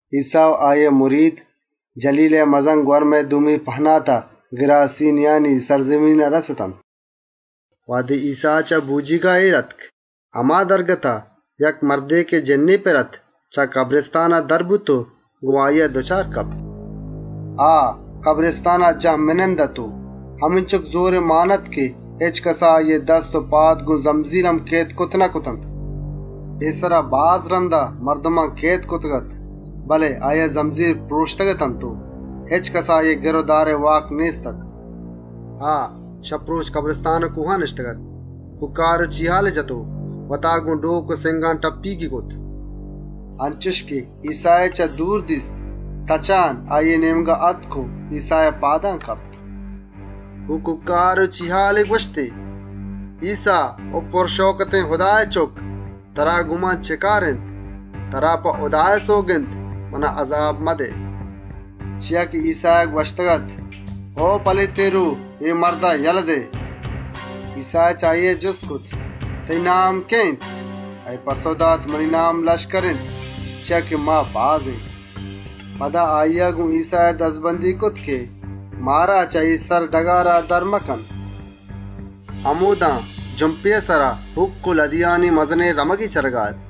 ‏ ایسّا و آییئے مرید، جَلیلئے مَزَن‌گوَرمئے دومی پهناتا گِراسیانی سرڈگارا رَستنت. ‏ وهدے ایسّا چه بۆجیگا اێر آتک، هما دمانا یک مردے که جِنّی پِر اَت، چه کبرستانا در بوت و گۆن آییا دُچار کپت. ‏ آ، کبرستانا جهمنند اَت و همینچُک زۆری مان اَت که هچکَسا آییئے دست و پاد گۆن زمزیل هم کئید کرتَ نکرتنت. ‏ پێسرا باز رَندا مردمان کئید کرتگ‌اَت، بله آییا زمزیل پرۆشتگ‌اتنت و هچکَسا آییئے گِر و دارئے واک و توان نێست‌اَت. ‏ آ، شپ و رۆچ کبرستان و کۆهان نِشتگ‌اَت، کوکّار و چیهالیَ جت و وتا گۆن ڈۆک و سِنگ ٹپّیگیَ کرت. ‏ انچُش که ایسّایی چه دورا دیست، تچانا آییئے نێمگا آتک و ایسّائے پادان کپت. ‏ گۆن کوکّار و چیهالے گوَشتی: «ایسّا، او مَزَن‌شانێن هُدائے چُکّ! ترا گۆن من چِه کار اِنت؟ ترا هُدائے سئوگند اِنت، منا اَزاب مدئے.» ‏ چیا که ایسّایا گوَشتگ‌اَت: «او پلیتێن روه! اے مردا یله دئے.» ‏ ایسّایا چه آییا جُست کرت: «تئیی نام کئے اِنت؟» آییا پَسّئو دات: «منی نام ‹لشکر› اِنت، چیا که ما باز اێن.» ‏ پدا آییا گۆن ایسّایا مِنَّت و زاری کرت که: «مارا چه اے سرڈگارا در مکن.» ‏ همۆدا جُمپێئے سرا، هوکّانی مزنێن رمگے چَرگا اَت. ‏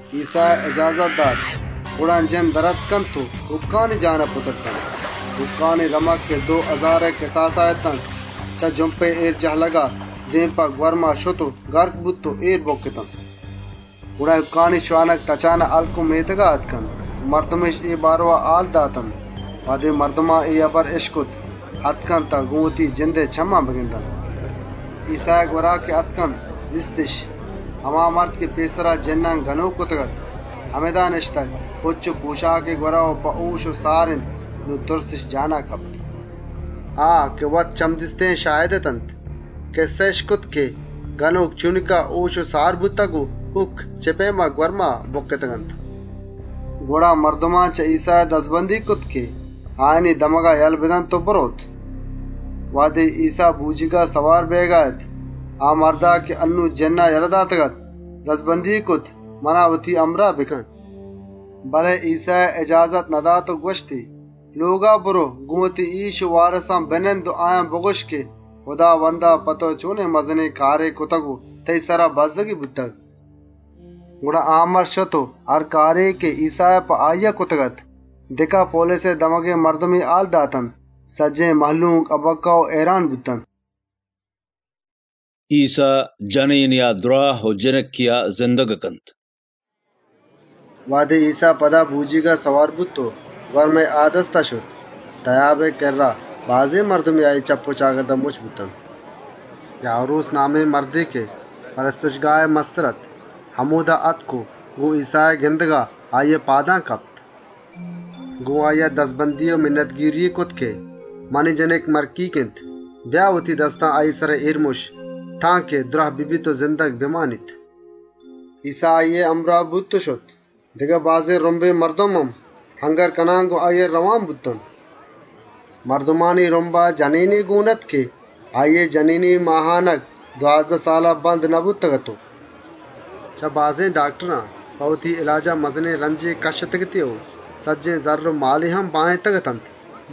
ایسّایا اجازت دات. گڑا، جِنّ در آتکنت و هوکّانی جسما پُترتنت. هوکّانی رمگ که دو هزارئے کِساسا اَت، چه جُمپا جَهلگا اێر کپانا گوَرما بُکّت. ‏ گڑا، هوکّانی شوانگ شهر و مێتگان تتکنت و مردمِش اے بارئوا هال داتنت. وهدے مردمان اے هبر اِشکت، آتکنت تان گۆن وتی جندئے چمّان اے سرگوَستا بگندنت. ‏ ایسّائے گوَرا که آتکنت دیستِش، هما مرد که پێسرا جِنّان گنۆک کرتگ‌اَت، همِدا نِشتگ، پُچّ و پۆشاکی گوَرا و په هۆش و سار اِنت. نون تُرسِش دلا نِشت. ‏ آ که وت چَمدیستێن شاهد اتنت، کِسّهِش کرت که جِنّی گنۆک چۆنکا هۆش و سار بوتگ و هوکّ چِه پئیما گوَرما بُکِّتگ‌اَنت. ‏ گڑا مردمان گۆن ایسّایا دَزبندی کرت که آیانی سرڈگارا یله بدنت و برئوت. ‏ وهدے ایسّا بۆجیگا سوار بئیگا اَت، آ مردا که انّون جِنّا یله داتگ‌اَت دَزبندی کرت: «منا وتی همراه کن.» ‏ بله ایسّایا اجازت ندات و گوَشتی: «لۆگا برئو و وتی مردمان هال بدئے که هُداوندا په تئو چۆنێن کارے کرتگ و تئیی سرا چۆن بَزّگی بوتگ.» ‏ گڑا، آ مرد شت و هر کارے که ایسّایا په آییا کرتگ‌اَت، دِکاپولیسئے سرڈگارئے مردمی هال داتنت. سجّهێن مهلوک، هَبَکَّه و هئیران بوت. ایسّا جنێنێا دْراه و جنکێا زندگَ کنت ‏ وهدے ایسّا پدا بۆجیگا سوار بوت و گوَرمئے آ دستا شت، تئیابئے کِرّا، مردمانی مزنێن رُمبے آییئے چپّ و چاگردا مُچّ بوت. ‏ یایْروس نامێن مردے که کنیسهئے مستر اَت، همۆدا آتک و گۆن ایسّائے گِندگا، آییئے پادان کپت. ‏ گۆن آییا دَزبندی‌ای کرت که: «منی جنک مَرکیگ اِنت. بیا و وتی دستا آییئے سرا اێر مُش، تانکه دْراه ببیت و زندگ بمانیت.» ‏ ایسّا آییئے همراه بوت و شت. دگه بازێن رُمبے مردم هم، اَنگِرّ کنان گۆن آییا رئوان بوت. ‏ مردمانی رُمبا جنێنے گۆن اَت که دوازده سال اَت آییئے هۆن بند نبوتگ‌اَت و ‏ چه بازێن داکتران په وتی اِلاجا مزنێن رنجے کَشّتگ‌اَتی و سجّهێن زَرّ و مالی هم باهێنتگ‌اتنت،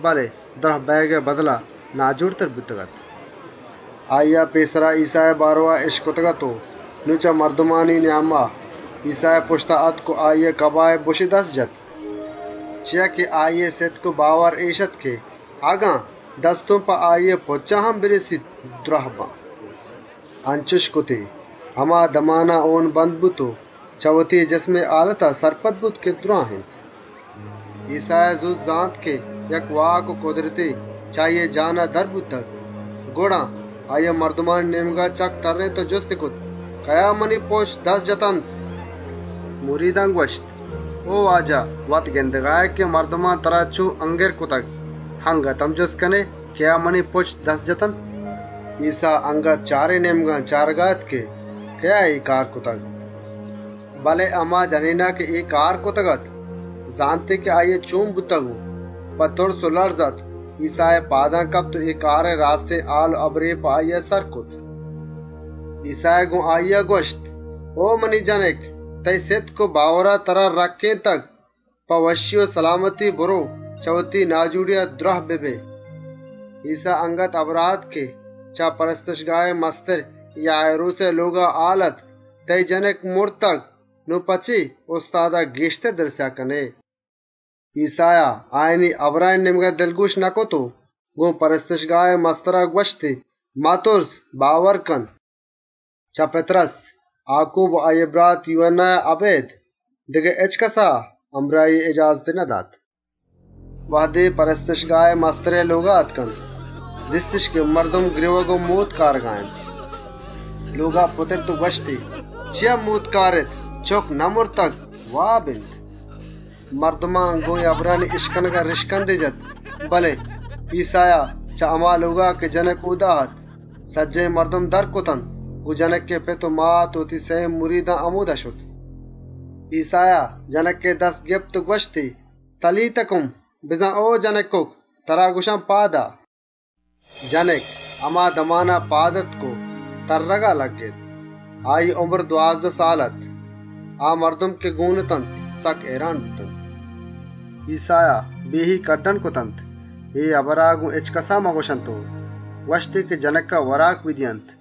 بله دْراه بئیگئے بدلا ناجۆڑتر بوتگ‌اَت. ‏ آییا پێسرا ایسّائے بارئوا اِشکتگ‌اَت و نون چه مردمانی نیاما ایسّائے پُشتا آتک و آییئے کَباهی دست جت. ‏ چیا که آییئے سِتک و باور اِش اَت که: «اگن ایسّائے پُچّان هم دست پِر بکنان، دْراهَ بان.» ‏ انچُشی کرت، هما دمانا هۆن بند بوت و چه وتی جسمئے هالتا سرپد بوت که دْراه اِنت. ‏ ایسّایا زوت زانت که یک واک و کُدرتے چه آییا در بوتگ. گڑا آییا مردمانی نێمگا چَکّ تَرّێنت و جُستی کرت: «کئیا منی پُچّ دست جتنت؟» ‏ مریدان گوَشت: «او واجه! وت گِندگا ائے که مردمان ترا چۆن اَنگِرّ کرتگ، اَنگت هم جُستَ کنئے: ‹کئیا منی پُچّ دست جتنت؟›» ‏ ایسّا اَنگت چارێن نێمگان چارگا اَت که کئیا اے کار کرتگ. ‏ بله هما جنێنا که اے کار کرتگ‌اَت، زانتی که آییا چۆن بوتگ و په تُرس و لَرز آتک، ایسّائے پادان کپت و اے کارئے راستێن هبر و هالی داتنت. ‏ ایسّایا گۆن آییا گوَشت: «او منی جنک! تئیی سِتک و باورا ترا رَکّێنتگ، په وشّی و سلامتی برئو و چه وتی ناجۆڑیا دْراه ببئے.» ‏ ایسّا اَنگت هبرا اَت که چه کنیسهئے مسترئے لۆگا، مردمے آتک و یایْروسی هال دات که: «تئیی جنک مرتگ، نون په چے استادا گێشتر دلسیاهَ کنئے؟» ‏ ایسّایا آیانی هبرانی نێمگا دلگۆش نکرت و گۆن کنیسهئے مسترا گوَشتی: «متُرس، باور کن.» ‏ چه پِتْرُس، آکوب و آییئے برات یوهَنّایا اَبێد، دگه هچکَسا همراهیئے اِجازتی ندات. ‏ وهدے کنیسهئے مسترئے لۆگا آتکنت، دیستِش که مردم گرێوگ و مۆتک آرگا اَنت. ‏ لۆگا پُترت و گوَشتی: «چیا مۆتکَ کارێت؟ چُکّ نمرتگ، بَسّ واب اِنت.» ‏ مردمان گۆن اے هبرانی اِشکنگا ریشکندے جت، بله ایسّایا چه هما بانا که جنک اۆدا اَت، سجّهێن مردم در کرتنت و گۆن جنکئے پت و مات و وتی سئیێن مریدان همۆدا شت. ‏ ایسّایا جنکئے دست گپت و گوَشتی: «تَلیتا کُم!» بزان: او جنکُک! پاد آ. ‏ جنک هما دمانا پاد آتک و تَرّگا لگِّت. اُمری دوازده سال اَت. آ مردم که گۆن اتنت سکّ هئیران بوتنت. ‏ ایسّایا په ترندی هُکم کرتنت: «اے هبرا گۆن هچکَسا مگوَشێت» و گوَشتی: «جنکا وراک بدئیێت».